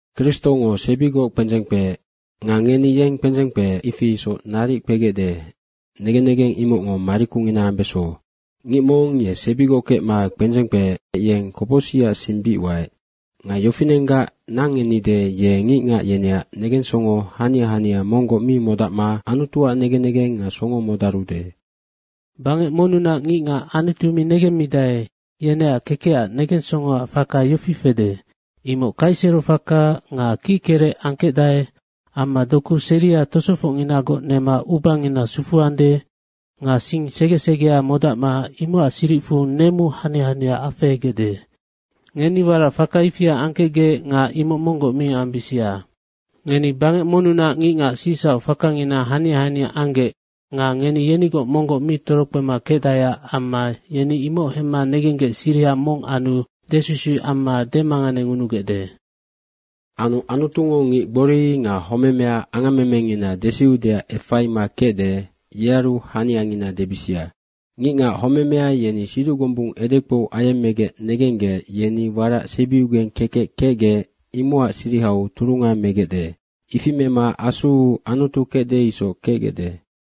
Kristongo sebigoc kpendzeng kpeec. Nga ngeni yeng kpendzeng kpeec, ifi isoc naric kpegecde, negen negeng imocngo marikungina ambeso. Ngic mong ye sebigoc kecma kpendzeng kpeec, yeng kopocsicac sing bic waec. Nga yofinenggac nangennide, ye ngicngac yeneac negensongo hania hania monggoc mi modacma Anutuac negen negeng nga songo modarude. Bangec monnunac ngicngac Anutu mi negemmidae, yeneac kekecac negensongoac faka yofi fede, imoc kaiserofaka nga kickerec angkecdae amma doku seria tosofocnginagoc nema ubangina sufuande nga sing sege segea modacma imocac siricfu nemu hania hania afehegecde. Ngeni warac faka ifia angkecgec imoc monggoc mi ambisia. Ngeni bangec monnunac ngicngac sicsauc fakangina hania hania anggec ngeni yenigoc monggoc mi torokpema kecdaeac amma yeni imoc hemma negenggec siriha mong anu desusuic amma demanganengunugecde. Anu Anutungo ngic gbori nga homemea angammemengina desiudeac efaima kecde, yearu haniangina debisia. Ngicngac homemea yeni siduc gombung edekpou ayemmegec negenggec, yeni warac sebiugeng kekec kecgec, imocac sirihau turunga megecde. Ifi mema asuu Anutu kecde isoc kecgecde.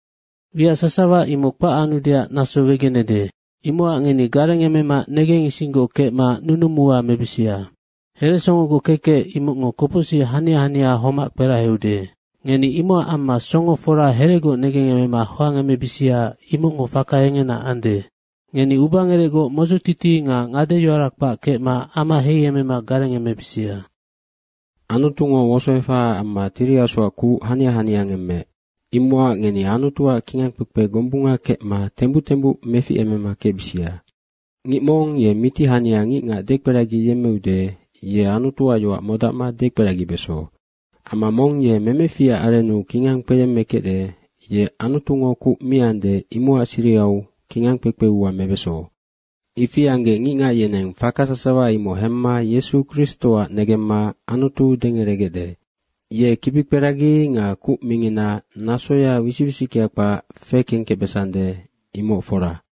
Wiac sasawa imoc kpac anudeac naso wegenede. Imocac ngeni garengemema negengisinggoc kecma nunumu ua mebisia. Heresongogoc kekec imocngo kopocsic hania hania homac kperaheude, ngeni imocac amma songo fora heregoc negengemema hoangemebisia, imocngo faka engena ande. Ngeni ubangerecgoc modzotiti nga ngadeyoara kpac kecma ama heiemema garengemebisia. Anutungo wosoefahaac amma Tiri Asuac kuc hania hania ngemmeec, imocac ngeni Anutuac kingang kpekpe gombunga kecma tembuc tembuc meficemema kecbisia. Ngic mong ye miti hania ngicngac dekperagiyemmeude, ye Anutuac yoac modacma dekperagibeso. Amma mong ye memeficac arennu kingang kpeyemmekecde, ye Anutungo kuc miande, imocac sirihau kingang kpekpe ua mebeso. Ifi anggec ngicngac yeneng faka sasawa imoc hemma Yesu Kristoac negemma Anutu dengeregecde. Ye kibikperagi nga kuc mingina nasoya wisic wisickea kpac fekengkecbesande, imoc fora.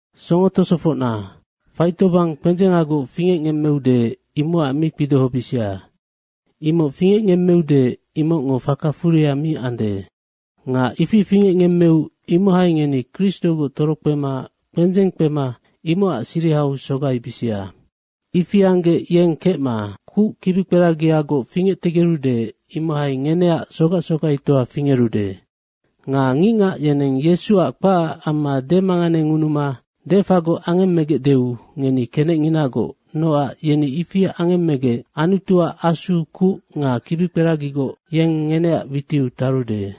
Songo tosofocna, faitobang kpendzengagoc fingecngemmeude, imocac mi kpidohobisia. Nga imoc fingecngemmeude, imocngo faka furia mi ande. Nga ifi fingecngemmeu imohai ngeni Kristogoc torokpema kpendzeng kpema imocac sirihau sogaibisia. Ifi anggec yeng kecma kuc kibikperagiagoc fingectegerude, imohai ngeneac sogac sogaitoa fingerude. Nga ngicngac yeneng Yesuac kpacac amma demanganengunuma defagoc angemmegecdeu ngeni kenecnginagoc, nocac yeni ifi angemmegec Anutuac Asu kuc nga kibikperagiagoc, yeng ngeneac witiu tarude.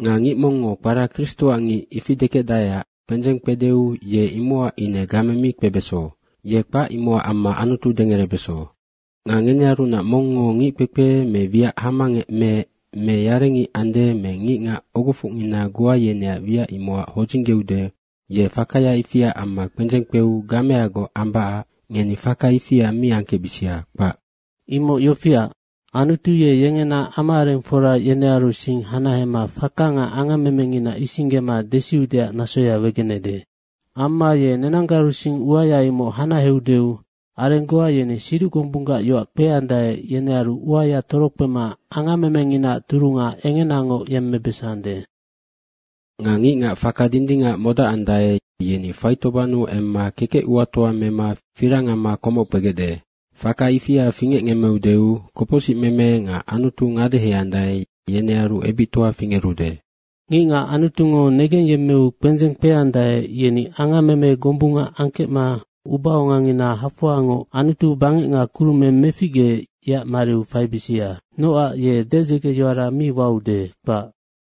Nga ngic mongngo kpara, “Kristoac ngic,” ifi dekecdaeac kpendzeng kpedeu ye imocac ine game mi kpebeso, ye kpac imocac amma Anutu dengerebeso. Nga ngenearunac mongngo ngic kpekpe me wiac hamangec meec me yarengic ande me ngicngac ogofocngina goa yeneac wiac imocac hodzinggeude, ye fakaya ifiac amma kpendzeng kpeu gameagoc ambacac ngeni faka ifia mi angkecbisia, kpac. Imoc yofiac, Anutu ye yengena ama arengfora yenearu sing hanahema faka nga angammemengina isinggema desiudeac nasoya wegenede. Amma ye nenanggaru sing uaya imoc hanaheudeu areng goa yeni siduc gombunggac yoac kpeandae, yenearu uaya torokpema angammemenginaac turunga engenangoc yemmebesande. Nga, “Ngicngac faka dindingac modacandae, yeni faitobannu emma kekec uatoa mema firang amma komoc kpegecde. Faka ifia fingecngemmeudeu, kopocsicmeme nga Anutu ngadeheandae, yenearu ebictoa fingerude.” Ngicngac Anutungo negengyemmeu kpendzeng kpeandae, yeni angammeme gombunga angkecma ubaongangina hafoangoc Anutu bangec nga kurumeng meficgeec, yeac mariu faibisia, nocac ye dedzegeyoara mi waude, kpac.